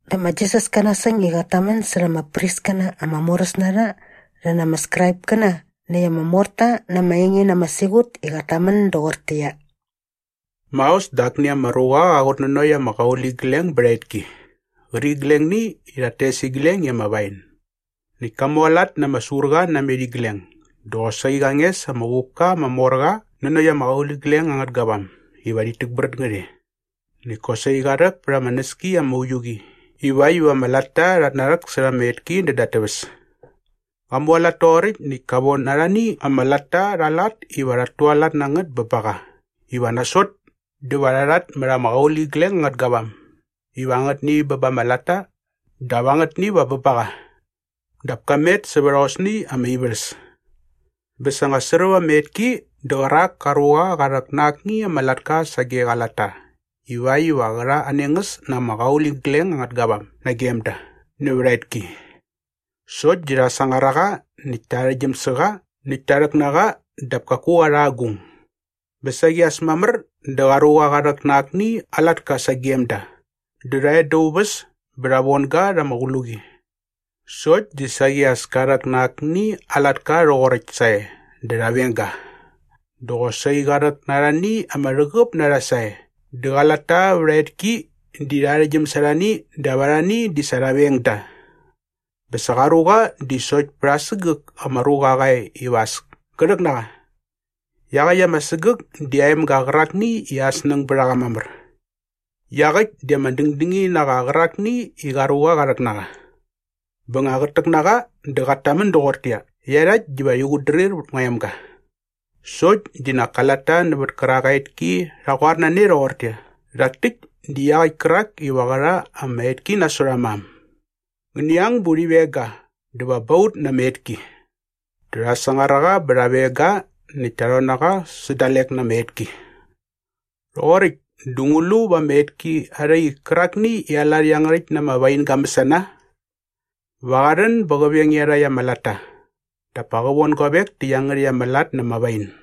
Dä ma Jisas ka nasäng i qat tamän särha ama priskäna ama moräs na rha rhi na ama Skraipkäna näkt ama morta na ama enge na ama siqut i qat tamän doqortäqyia, “Maos dä akni ama ruqa qa qutnanokt ama qauligleng bät aa etki qärqiglengni i rhat tes igleng i ama wain. Näkt ka mualat na ama surqa namet igleng dä qosaqi qa nges ama uqupka ama mor qa nanokt ama qauligleng angät gavam iva rhit täkbrät ngät e. Näkt kosaqi qa rhäk pät ama näski ama uiu qi ivakt iva ama latta rhat narhäksärha ama etki näda at täväs. Qa mualat toqoräkt näkt ka von arhani ama latta rha aa lat iva rhat tualat na ngät bä ba qa iva nasot dä va rha rhatmät ama qauligleng angät gavam iva angätni bä ba ama latta dap angätni va bä ba qa. Dap ka met sävät aosni ama ivärhäs. “Bä sa nga sräp ama etki dä qärak ka ruqa qa rhäk na akni ama latka sage qa latta ivakt iva qä rha aa nengäs na ama qauligleng angät gavam nagem da nävät aa etki. Sokt di rha sangar a qa näkt ta arhäktgyäm sä qa näkt ta rhäk na qa dap kaku qa rha agung. “Bä saqi as mamär dä qa ruqa qa rhäk na akni aa latka sagem da. Dä rha e da aa uväs bä rha von ga rha ama qluqi. Sokt di saqi as ka rhäk na akni aa latka rhoqoräkt sae dä rha veng ga. Dä qosaqi qa rhäk na arhani ama rhäqäp na rha sae dä qa latta vät aa etki di rha arhäktgyäm sa arhani dap arhani di sa rha veng da. “Bä sa qa ruqa di sokt pät aa sägäk ama ruqa qa e iva as kä rhäk na qa. Iaqäkt ama sägäk di aa emga qärakni i aa snäng bät a qa mamär. Iaqäkt di ama dängdängini na qa qärakni i qa ruqa qa rhäk na qa. Bä nga qät täk na qa dä qat tamän doqortäqyia, ‘Iarhakt diva rhi qutdrir vät ngua emga!’ Sokt di nak ka latta nävät kärak aa etki rha qoar na ne rhoqortäqyia, ‘Rhak täkt di iaqäkt kärak iva qä rha ama etki nasot aa mam. Ngäni ang bä urhi veng ga dä va ba ut na ama etki.’ Dä rha sangar a qa bä rha veng ga näkt ta rhon na qa sä dalek na ama etki. “Rhoqoräkt dä ngu lu va ama etki arha ik kärakni i aa lat iangärhäkt na ama wain ga mäsana? Va qa rhän bä qä veng iarhakt ama latta dap pa qä von guavek tä iangärhäkt ama lat na ama wain.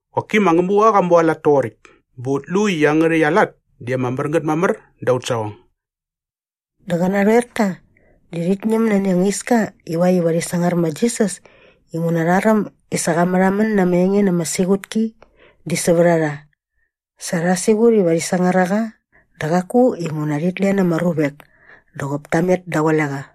Qoki ma Ngämuqa qa mualat toqoräkt bä ut lu i iangärhäkt aa lat di ama mär ngät mamär da aut saqong’?” Dä qä narhoerta di rhit ñäm nani anga iska ivakt iva rhi sangar ma Jisas inguna rha räm i sa qa märhamän na ama enge na ama siqutki di sävät a rha. Sa rha siqut iva rhi sangar a qa dä qaku inguna rhit len ama ruvek dä qop ta met daqule qa.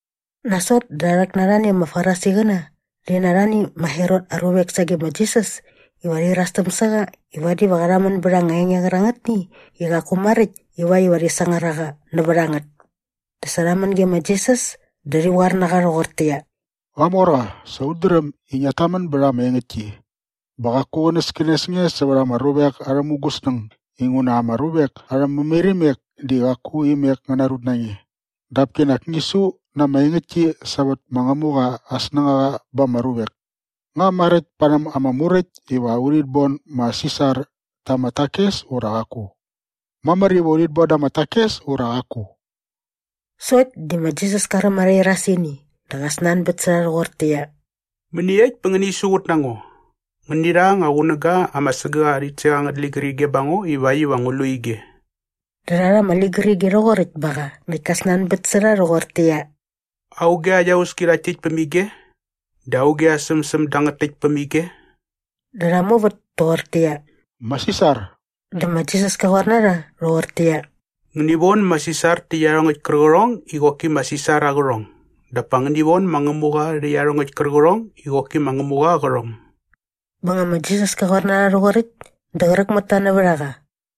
Nasot dä rha rhäk na arhani ama Farisiqäna rhi na arhani ma Herot aa ruvek sage ma Jisas iva rhi irastäm sä qa i vadi va qa rhamän bät anga enge qärangätni i qaku maräkt ivakt iva rhi sangar a qa nävät a ngät. Dä sa rha män ge ma Jisas dä rhi qoar na qa rhoqortäqyia, “Qamorqa, sa ut dräm i ngiat tamän bät ama engäktki bä qaku qänäskänes nge sävät ama ruvek arhä mungäsnäng inguna ama ruvek arhä mämairimek di qaku imek ngä narut na nge. Dap kinak ngi su na ama engäktki sävät ma Ngämuqa aa snängaqa ba ama ruvek. Nga maräkt parhäm ama Muräkt iva urhit bon ma Sisar ta ama takes ura qaku? Mamär iva urhit bon da ama takes ura qaku?” Sokt di ma Jisas ka räm arha irasini dä qa snanbät sä rha rhoqortäqyia, “Mäniekt bä ngäni siqut na ngo? Ngäni rha anga qunäga ama sägäk aa rhitsek angät ligärige ba ngo ivakt iva ngu lu ige.” Dä rha rha ama ligärige rhoqoräkt ba qa näkt ka snanbät sä rha rhoqortäqyia, “Auge aa iauski rhakt täkt päm ige? Dä auge aa sämsäm dangät täkt päm ige?” Dä rha muvät toqortäqyia, “Ma Sisar.” Dä ma Jisas ka qoar na rha rhoqortäqyia, “Ngäni von ma Sisar tä iarhongäkt kärqärhong i qoki ma Sisar aa qärhong dap pa ngäni von ma Ngämuqa rhä iarhongäkt kärqärhong i qoki ma Ngämuqa aa qärhong.” Bä nga ma Jisas ka qoar na rha rhoqoräkt dä qräk mät ta nävät a qa.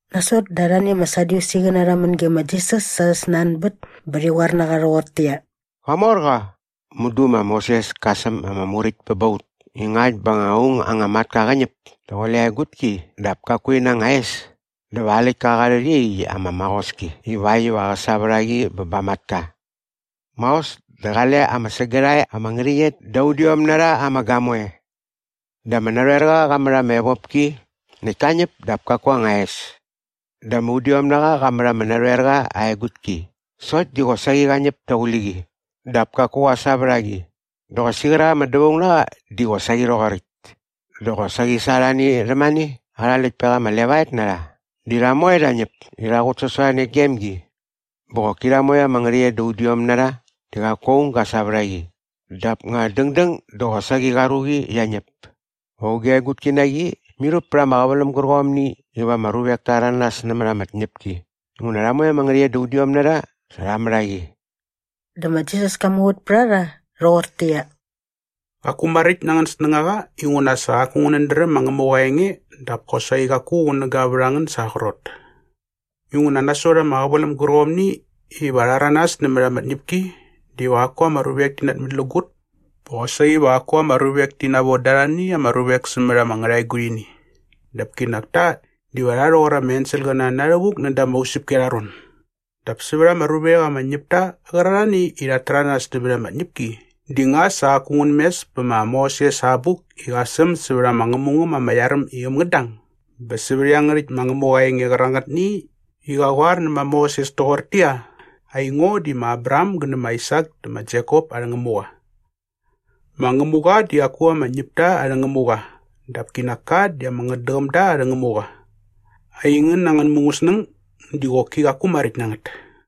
Nasot dä arhani ama Sadyusiqäna rha män ge ma Jisas sa arhä snanbät bä rhi qoar na qa rhoqortäqyia, “Qamorqa! Mudu ma Moses ka säm ama muräkt bä ba ut i ngakt bä nga aung anga matka qä ñäp daqule aa egutki dap kaku ina anga es dä va aa läktka qa rhät iaqyäkt ama maqoski ivakt iva qä sa vät a qi bä ba aa matka. Maos dä qale ama sägärhae ama ngärhäqyet da udiom na rha ama gamoe. Dä ama narhoerqa qa mät ama evopki näkt ka ñäp dap kaku aa anga es. Dä ama udiomnaqa qa mät ama narhoerqa aa egutki sokt di qosaqi qa ñäp daqule qi dap kaku qa sa vät a qi. Dä qosaqi qärak ama dävaungnaqa di qosaqi rhoqoräkt. Dä qosaqi sa arhani rhämane arha läktpek ama levaet na rha di rha moe rha ñäp i rha qutsasorhane gem gi. Bä qoki rha moe ama ngärhäqyet da udiom na rha di qaku aung ga sa vät a qi. Dap nga dängdäng dä qosaqi qa ruqi qia ñäp. Va auge aa egutki na qi mirhup pät ama qäväläm gärqomni iva ama ruvek ta rhäranas nämät ama tñäpki inguna rha moe ama ngärhäqyet da udiom na rha sa rha mät a qi?” Dä ma Jisas ka muvät pät a rha rhoqortäqyia, “Qaku maräkt na angän snängaqa inguna sa qaku ngänät dräm ma Ngämuqa aa enge dap kosaqi qaku qunäga vät a ngän sa aa qrot. Inguna nasot ama qäväläm gärqomni iva rha rhäranas nämät ama tñäpki diva qaku ama ruvek ti namätlägut bä qosaqi va qaku ama ruvek ti navon da arhani ama ruvek sämät ama ngärhaegurhini dap kinak ta diva rha rhoqor ama enselqäna na rhävuk da ama usäpki arha ron. Dap sävät ama ruvek ama ñäp ta qärarhani i rhat täranas nämät ama tñäpki di nga sa qaku ngän mes pä ma Moses aa abuk i qa säm sävät ama ngämungäm ama iar äm i äm ngät dang. Bä sävät iangärhäkt ma Ngämuqa aa enge qärangätni i qa qoar nä ma Moses toqortäqyia, ‘Aingo di ma Abraham gä nä ma Aisak dä ma Jekop arhä Ngämuqa.’ Ma Ngämuqa di qaku ama ñäpta arhä Ngämuqa dap kinak ka di ama ngätdäqämda arhä Ngämuqa. Aingän angän mungäsnäng di qoki qaku maräkt na ngät.”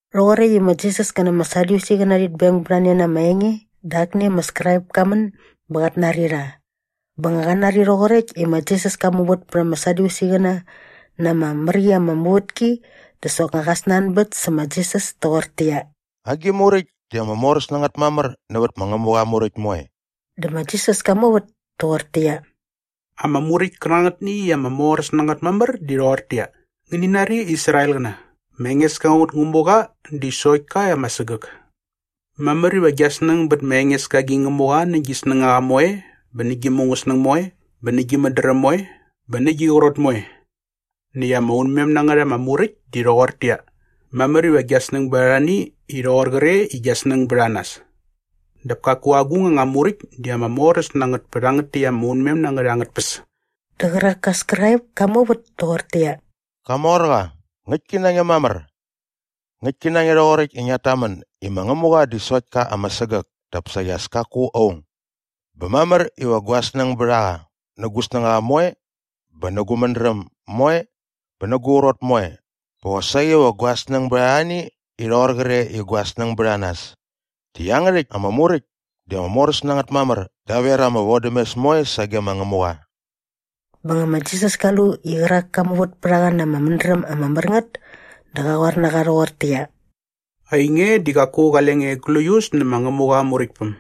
Rhoqoräkt i ma Jisas kä na ama Sadyusiqäna rhit beng bät a ne na ama enge dä akni ama Skraip ka män bä qat nari rha. Bä nga qa nari rhoqoräkt i ma Jisas ka muvät pät ama Sadyusiqäna na ama mär qi ama muvätki dä soknga qa snanbät sä ma Jisas toqortäqyia, “Agi muräkt di ama moräs na ngät mamär nävät ma Ngämuqa aa Muräkt moe?” Dä ma Jisas ka muvät toqortäqyia, “Ama muräkt kärangätni i ama moräs na ngät mamär di rhoqortäqyia, ‘Ngäni nari Israelqäna, ma Engeska aut Ngämuqa di sokt ka ama sägäk. Mamär iva gia snäng bät ma Engeska gi Ngämuqa nä gi snängaqa moe bä nä gi mungäsnäng moe bä nä gi mädräm moe bä nä gi qrot moe.’ Näkt ama unmem na ngät ama muräkt di rhoqortäqyia, ‘Mamär iva gia snäng bät arhani i rhoqor qre i gia snäng bät a nas.’ Dap kaku agung anga muräkt di ama moräs na ngät pä rhangät täkt ama unmem na ngät angät tpäs.” Dä qärak ka Skraip ka muvät toqortäqyia, “Qamorqa, ngäktki na nge mamär. Ngäktki na nge rhoqoräkt i ngiat tamän i ma Ngämuqa di sokt ka ama sägäk dap saqi as kaku aung. Bä mamär iva gua snäng bät a qa nä gu snängaqa moe bä nä gu mädräm moe bä nä gu qrot moe bä qosaqi va gua snäng bät arhani i rhoqor qre i gua snäng bät a nas. Di iangärhäkt ama muräkt di ama moräs na ngät mamär daver ama vodämes moe sage ma Ngämuqa.” Bä nga ma Jisas ka lu i qärak ka muvät pät a qa na ama mädräm ama mär ngät dä qa qoar na qa rhoqortäqyia, “Ainge di qaku qale nge gläius nä ma Ngämuqa aa Muräktpäm.”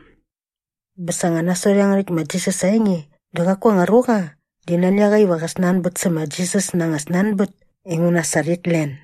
Bä sa nga nasot iangärhäkt ma Jisas aa enge dä qaku anga ruqa di nani a qa iva qä snanbät sä ma Jisas na anga snanbät inguna sa rhit len.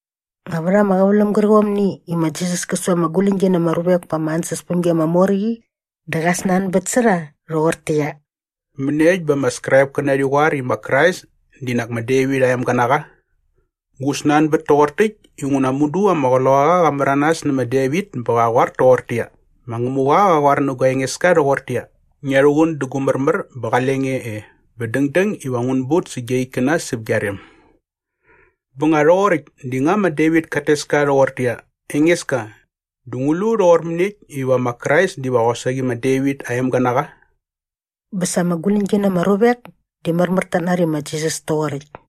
Nga vät ama qäväläm gärqomni i ma Jisas kä su ama guläñgi na ama ruvek pa ama ansäspämgi ama mor qi dä qa snanbät sä rha rhoqortäqyia, “Mäniekt bä ama Skraipkäna rhi qoar i ma Krais di nak ma Devit aa emga na qa? Ngu snanbät toqor täkt inguna mudu ama Qloqaqa qa märanas nä ma Devit bä qa qoar toqortäqyia, “‘Ma Ngämuqa qa qoar nä gua Engeska rhoqortäqyia, “Ngia rhuqun dä gu märmär bä qale nge e bä dängdäng iva ngun but sä gia ikkäna säp gia rem.” ’ Bä nga rhoqoräkt di nga ma Devit kat tes ka rhoqortäqyia, ‘Engeska’ dä ngu lu rhoqor mäniekt iva ma Krais diva qosaqi ma Devit aa emga na qa?” Bä sa ama guläñgi na ama ruvek di märmär tat nari ma Jisas toqoräkt.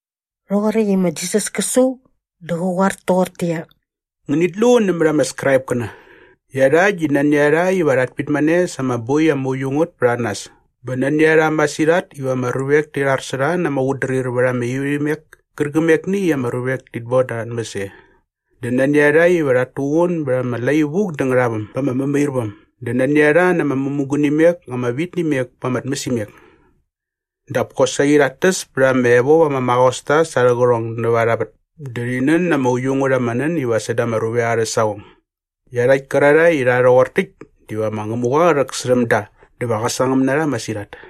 Rhoqoräkt i ma Jisas kä su dä qä qoar toqortäqyia, “Ngänit lu nämät ama Skraipkäna. Iarhakt di nani a rha iva rhat pitmane sa ama boi ama uiu ngät pät a nas bä nani a rha masirhat iva ama ruvek ti rhar sä rha na ama qutdrir vät ama ivärhimek kärqämekni i ama ruvek tit boda arha tmäs e dä nani a rha iva rhat tuqun bät ama lai vuk dä ngärhaväm ba ama mämairväm dä nani a rha na ama mämugunimek ama vit nä imek pa ama tmäsimek. Dap kosaqi rhat täs pät ama evop ama maqosta sa arhä qärhong näva arha vät dä rhi nän na ama uiu ngät ama nän iva säda ama ruvek arhä saqong. Iarhakt kärarhae i rha rhoqor täkt diva ma Ngämuqa qä rhäksärhäm da dä va qä sangäm na rha masirhat.”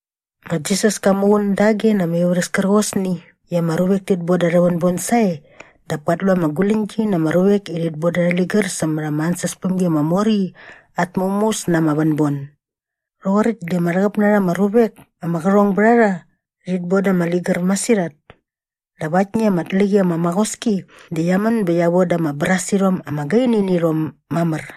Ma Jisas ka muqun dage na ama ivärhäs kärqosni i ama ruvek tit boda arhä vänbon sae dap kat lu ama guläñgi na ama ruvek i rhit boda arhä ligär sämät ama ansäspämgi ama mor qi at mämuäs na ama vänbon. Rhoqoräkt di ama rhäqäp na rha ama ruvek ama qärhong bät a rha rhit boda ama ligär masirhat. Dap aktni ama tlä qi ama maqoski di qia män bä qia voda ama brasirhom ama gaini nä irhom mamär.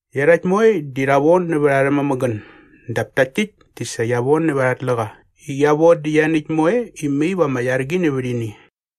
Iarhakt moe di rha von nävät arhä mämägän dap takt täkt di sa qia von nävät arha tläqa i qia von dä ianiäkt moe i mai va ama iar qi nävät ini.”